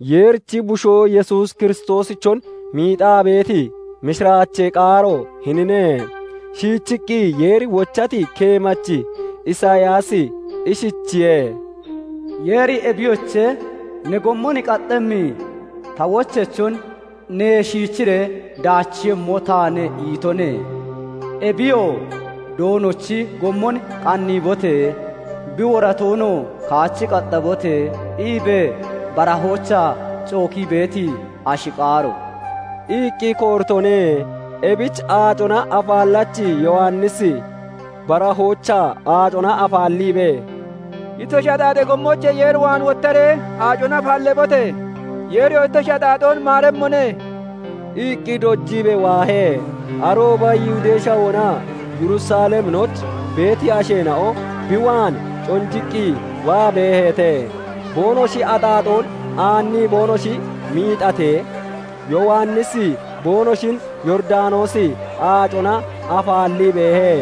Yeerichi Bushoo Yesuus Kiristoosichon miixaa beeti mishiraachee qaaro hinine. Shiichiqqi Yeeri wochati keemachi Isiyaasi ishichiye:- "Yeeri 'Ebiyoche! Ne gommon qaxemmi ta wocheyachon neyee shiichiree daachiiyemmo taane' itone. Ebiyoo 'Doonochi gommon qanniibote! Bi woratoonoo kaachi qaxabote!' iibee barahoochaa cookii beeti ashi qaaro" iqqi kooritone. Ebich Aacona Afaallachi Yowannisi barahoochaa aacona afaalliibee, "Ittoshi axaaxee gommoochee Yeer waan wottaree aacona afaalleebote! Yeeriyoo ittoshi axaaxoon maaremmone" iqqi dojiibee waahe. Arooba Yihudee Shawoonaa Yerusaleminooch beeti aasheena'o bi waan conjiqqi waa beeheete; boonoshi axaaxoon aannii boonoshi miixatee, Yowannisi boonoshin Yooridanoosi Aacona afaallii beehe.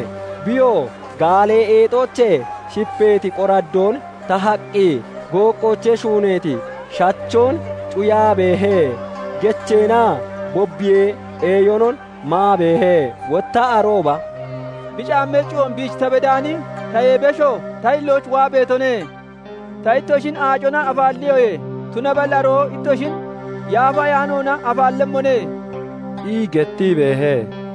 Biyoo gaallee eexoochee shipeeti qoraddoon tahaqqi gooqqoocee shuuneeti shachoon cuyaa beehe; gecheenaa bobiyee eeyonon maa beehe. Wotta arooba "Bi caammee cuyoon biich ta bedaani tayee besho ta hillooch waa beetone. Ta ittoshin aacona afaalliyoye; tunaballi aroo ittoshin Yaafa Ayaanoona afaallemmone" ii gettii beehe.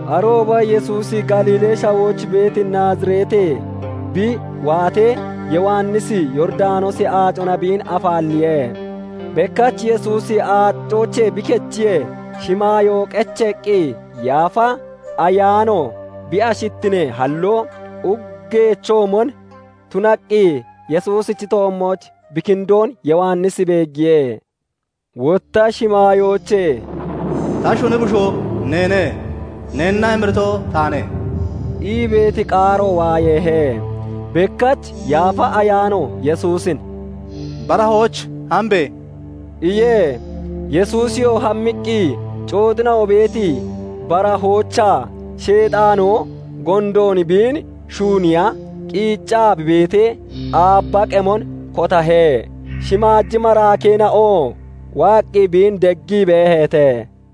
Arooba Yesuusi Galiilee Shawooch beeti Naazireetee bi waatee, Yowannisi Yooridanoosi Aacona biin afaalliye. bekkach Yesuusi aacooche bi kechiyee, shimaayo qeceeqqi Yaafa Ayaano bi ashittinee halloo uggeechoomon tunaqqi Yesuusichi toommooch bi kindoon Yowannisi beeggiye. Wotta shimaayoochee "Ta shuni bushoo neene; neenna emirito taane" ii beeti qaaro waayeehe. Bekkach Yaafa Ayaano Yesuusin "Barahooch hambe!" iye. Yesuusiyoo hammiqqi, cooxina'o beeti barahoochaa Sheexaanoo gondoon biin shuunniiya qiicaa bi beetee, aabba qemon kotahe. Shimaaji maraakeena'oo waaqqi biin deggii beeheete.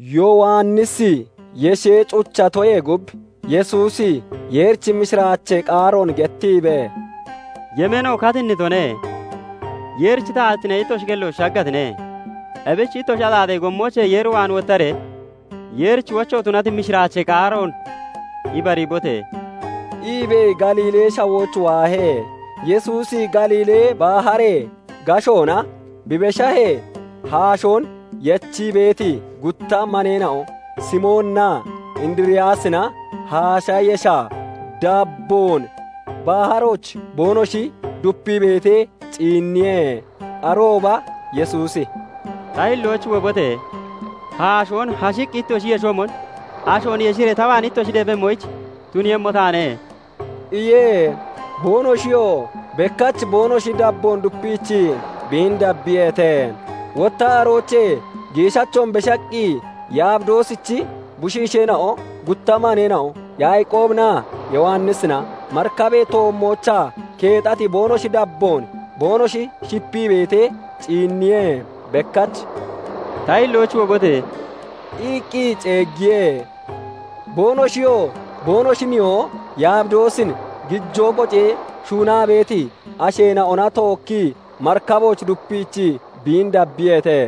Yowannisi yeshee cucheetoyee gub, Yesuusi Yeerichi mishiraachee qaaroon gettiibee, "Yemeeno katinnitone; Yeerichi taatittine ittoshi kellooch shaggatine; ebich ittoshi axaaxee gommoochee Yeer waan wottaree, Yeerichi wocho tunati mishiraachee qaaroon ibariibote!" iibee Galiilee Shawooch waahe. Yesuusi Galiili baharee gashoona bi beshahee, haashoon yechii beeti gutta maneena'o Simooninaa Indiriyaasina haashee yesha dabboon baharooch boonoshi dupii beetee ciinniye. Arooba Yesuusi "Ta hillooch wobote! Haashoon hashiqqi ittoshi yeshoomon ashoon yeshiree ta waan ittoshi deebemmoyich tuniiyemmo taane" iye. Boonoshiyoo bekkach boonoshi dabboon dupiichii biin dabbiyeete. Wotta aroochee giishachoon beshaqqi Yabidoosichi bushiisheena'o gutta maneena'o Yaaqoobinaa Yowannisina marikabee toommoochaa, keexati boonoshi dabboon boonoshi shipii beetee ciinniye. Bekkach "Ta hillooch wobote!" iqqi ceeggiye. Boonoshiyoo boonoshi nihoo Yabidoosin gijoo qocee shuunaa beeti asheena'ona tookkii marikabooch dupiichii biin dabbiyeete.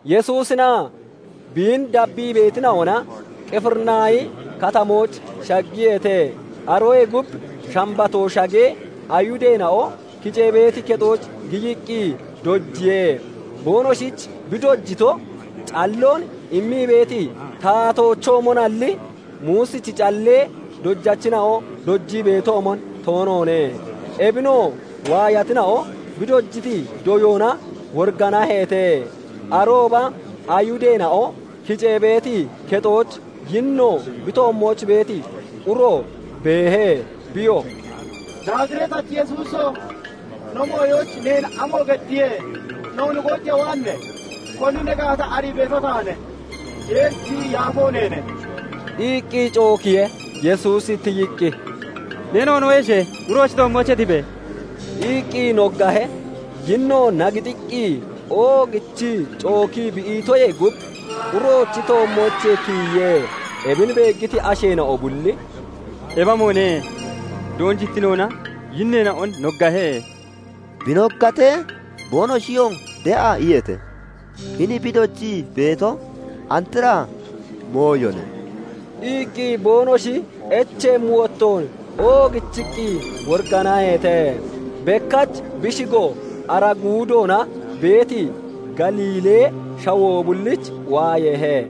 Yesuusinaa biin dabbii beetina'ona Qifirinaahi Katamooch shaggiyeete. Aroyee gub Shambatoo shagee, Ayihudeena'o kicee beeti kexooch giyiqqi dojiye. Boonoshich bi dojito calloon immii beeti taatoochoomonalli, Muusichi callee dojachina'o dojii beetoomon toonoone. Ebinoo waayatina'o bi dojiti doyoona woriganaheete. Arooba Ayihudeena'o kicee beeti kexooch yinno bi toommooch beeti uro beehe; Biyoo "Naazireetachi Yesuuso! No mooyooch neen amo geddiye? noon goojiiya waane? Koni ne gaata arii beeto taane; Yeerichi yaafo neene" iqqi cookiye. Yesuusi tiyiqqi, "Ne noonoon yeshe! Uroochi toommoochee tibe!" iqqi noggahe. Yinnoo nagixiiqqi oogichii cookii bi itoyee gub uroochi toommoochee tiyiye. Ebin beeggiti asheena'o bulli "Ebi amoone? Doonjittinoona yinneena'on noggahe; bi noggatee, boonoshiyoo de'a iyeete. Hini bi dojii beeto andra mooyone" iqqi boonoshi echeemmi wottoon oogichiqqi woriganaheete. Bekkach bi shigo ara guudoona beeti Galiilee Shawoo bulliich waayeehe.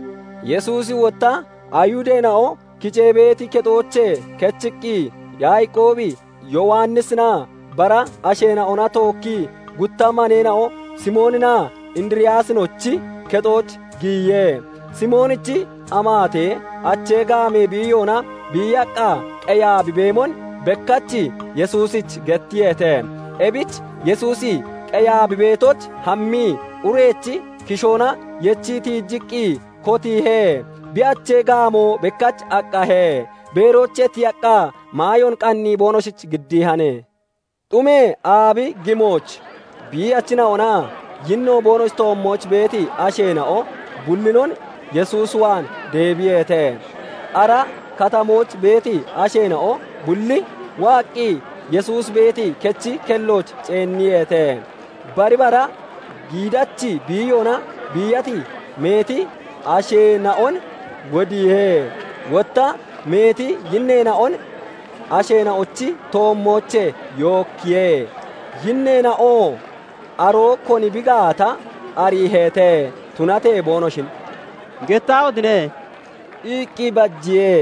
Yesuusi wotta Ayihudeena'o kicee beeti kexoochee kechiqqi Yaaqoobi, Yowannisinaa bara asheena'ona tookkii gutta maneena'o Simooninaa Indiriyaasinochi kexooch giyiye. Simoonichi amaate achee gaamee biiyoona biiyaqqaa qeyaa bi beemon bekkach Yesuusich gettiyeete. Ebich Yesuusi qeyaa bi beetooch hammii urechi kishoona yechii tiijiqqi kotiihe; bi achee gaamoo bekkach aqahe. Beeroochee tiyaqqaa maayoon qannii boonoshich giddiihan. Xumee aabi gimooch biiyachina'onaa yinno boonoshi toommooch beeti asheena'o bullinon Yesuus waan deebiyeete. Ara katamooch beeti asheena'o bulli waaqqi Yesuusi beeti kechi kellooch ceenniyeete. Bari bara giidachi biiyoona biiyati meeti asheena'on wodiihe; wotta meeti yinneena'on asheena'ochi toommoochee yookkiye. Yinneena'oo aroo koni bi gaata ariiheete; tunatee boonoshin "Gettaahotine!" iqqi bajiye.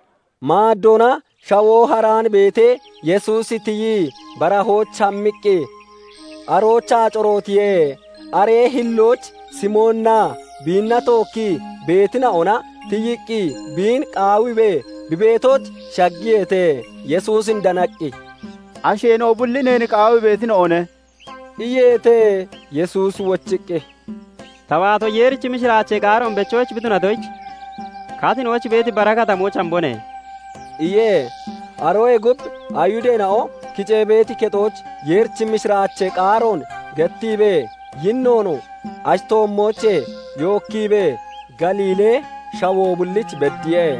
Maaddoona shawoo haraan beetee, Yesuusi tiyii barahooch hammiqqi aroochaa corootiye. Aree hillooch Simooninaa biinna tookkii beetina'ona tiyiqqi biin qaawiibee bi beetooch shaggiyeete. Yesuusin danaqqi, "Asheena'o bulli neen qaawii beetina'one" iyeete. Yesuusi wochiqqi, "Ta waato Yeerichi mishiraachee qaaroon bechoyich bi tunatoyich, katinooch beeti bara katamooch hambone" iye. Aroyee gub Ayihudeena'o kicee beeti kexooch Yeerichi mishiraachee qaaroon gettiibee, yinnoon ashi toommoochee yookkiibee Galiilee Shawoo bulliich beddiye.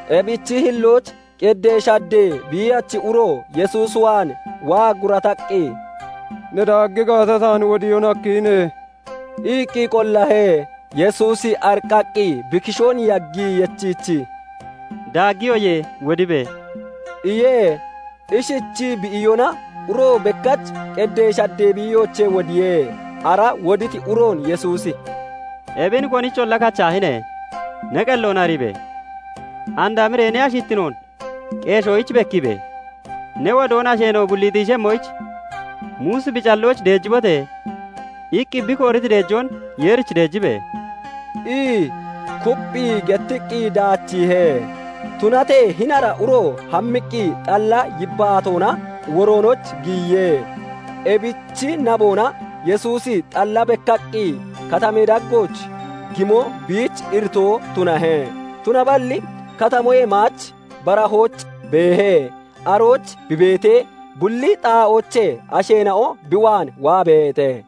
Ebichi hillooch qedee shaddee biiyachi uro Yesuus waan waa gurattaqqi, "Ne daaggi gaata, taan wodiyoon hakkihine" iqqi Qollahe. Yesuusi ariqqaqqi bi kishoon yagii yechiichii, "Daaggiyoye; wodibe!" iye. Ishichii bi iyona, uro bekkach qeddee shaddee biiyoochee wodiye. Ara woditi uroon Yesuusi "Ebin konicholla kachaahine! Ne qelloon ariibe! And hamiree ne aahittinoon qeeshoyich bekkiibe! ne wodoon asheena'o bulli xiishemmoyich, Muusi bi callooch 'Deejibote!' iqqi bi kooriti deejoon Yeerich deejibe!" ii kupphii gettiqqi daachiihe. Tunatee hini ara uro hammiqqi xalla yibbaatoonaa woroonooch giyiye. Ebichi naboona Yesuusi xalla bekkaqqi katamee daggooch gimo biich iritoo tunahe; tunaballi katamoyee maach barahooch beehe; arooch bi beetee, bulli xaa'oochee asheena'o bi waan waa beeheete.